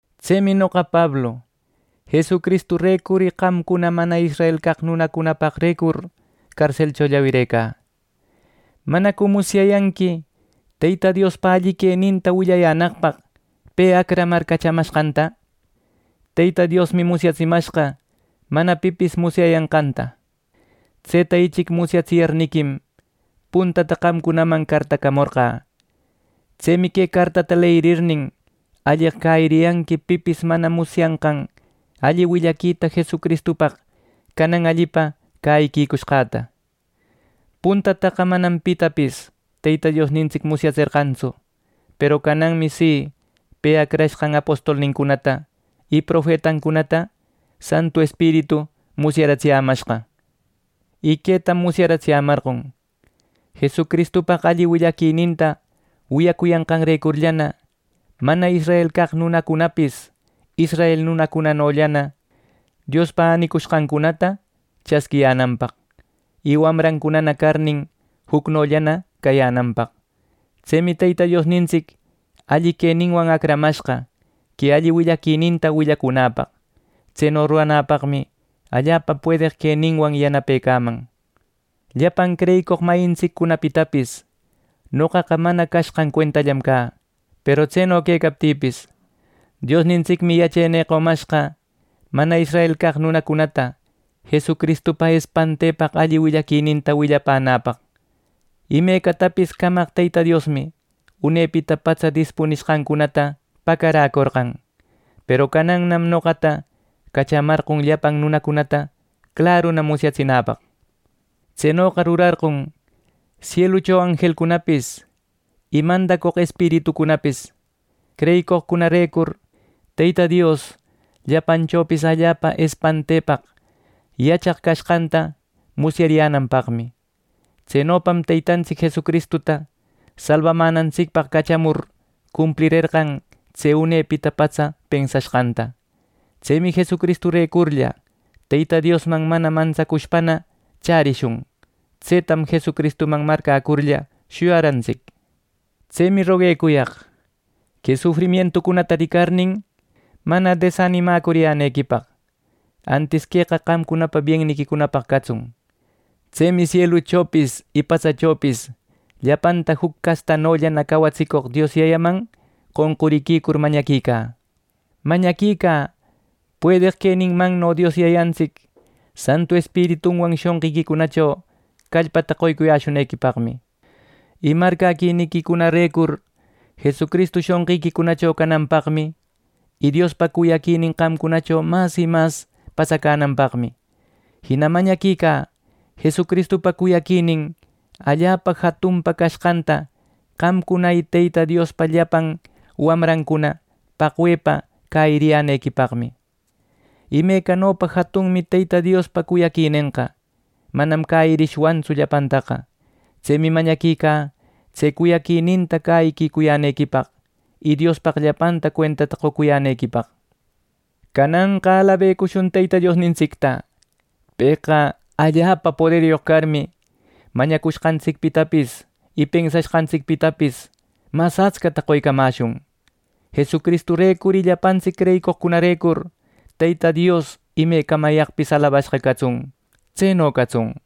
Tsemi noqa Pablu, Jesucristurecur y qamcuna mana israel caq nunacunapaqrecur carselcho llawirecä. ¿Manacu musyayanqui Teyta Diospa alli queninta willayänaqpaq pe acramar cachamashqanta! Teyta Diosmi musyatsimashqa mana pipis musyayanqanta. Tseta ichic musyatsiyarniquim, puntata qamcunaman cartacamorqä. Tsemi que cartata leyirirnin, alleq cäyiriyanqui pipis mana musyashqan alli willaquita Jesucristupaq canan allipa cäyiquicushqäta. Puntataqa manam pitapis Teyta Diosnintsic musyatserqantsu; peru cananmi si, pe acrashqan apostolnincunata y profetancunata Santu Espiritu musyaratsiyämashqa. Y quetam musyatsiyämarqon: Jesucristupaq alli willaquita wiyacuyanqanrecurllana mana israel caq nunacunapis israel nunacunanollana Diospa änicushqancunata chasquiyänanpaq; y wamrancunana carnin, jucnollana cayänanpaq. Tsemi Teyta Diosnintsic alli queninwan acramashqa que alli willaquininta willacunäpaq. Tseno ruranäpaqmi allapa puedeq queninwan yanapecaman. Llapan creyicoq mayintsiccunapitapis noqaqa mana cashqan cuentallam cä, peru tseno quecaptïpis, Diosnintsicmi yachenï qomashqa mana israel caq nunacunata Jesucristupa espantepaq alli willaquininta willapänäpaq. Imecatapis camaq Teyta Diosmi unepita patsa dispunishqancunata pacaräcorqan, peru canannam noqata cachamarqon llapan nunacunata claruna musyatsinäpaq. Tsenoqa rurarqon sielucho anjelcunapis y mandacoq espiritucunapis creyicoqcunarecur, Teyta Dios llapanchopis allapa espantepaq yachaq cashqanta musyariyänanpaqmi. Tsenopam Teytantsic Jesucristuta salbamänantsicpaq cachamur cumplirerqan tse unepita patsa pensashqanta. Tsemi Jesucristurecurlla Teyta Diosman mana mantsacushpana chärishun. Tsetam Jesucristuman marcäcurlla shuyarantsic. Tsemi roguecuyaq que sufrimientücunata ricarnin, mana desanimacuriyänequipaq. Antis queqa qamcunapa bienniquicunapaq catsun. Tsemi sieluchopis y patsachopis llapanta juc castatanolla cawatsicoq Dios Yayaman qonquriquicur mañaquicä. Mañaquicä puedeq queninmanno Dios Yayantsic Santu Espiritunwan shonqiquicunacho callpata qoyäshunequipaqmi, y marcäquiniquicunarecur Jesucristu shonqiquicunacho cananpaqmi, y Diospa cuyaquinin qamcunacho mas y mas patsacananpaqmi. Jina mañaquicä Jesucristupa cuyaquinin allapa jatunpa cashqanta qamcuna y Teyta Diospa llapan wamrancuna paqwepa cäyiriyänequipaqmi. Imecanopa jatunmi Teyta Diospa cuyaquinenqa manam cäyirishwantsu llapantaqa. Tsemi mañaquicä tse cuyaquininta cäyicuyänequipaq, y Diospaq llapanta cuentata qocuyänequipaq. ¡Cananqa alabecushun Teyta Diosnintsicta! ¡Pëqa allapa poderyoq carmi, mañacushqantsicpitapis y pensashqantsicpitapis mas atscata qoycamäshun! ¡Jesucristurecur y llapantsic creyicoqcunarecur, Teyta Dios imecamayaqpis alabashqa catsun! Tseno catsun.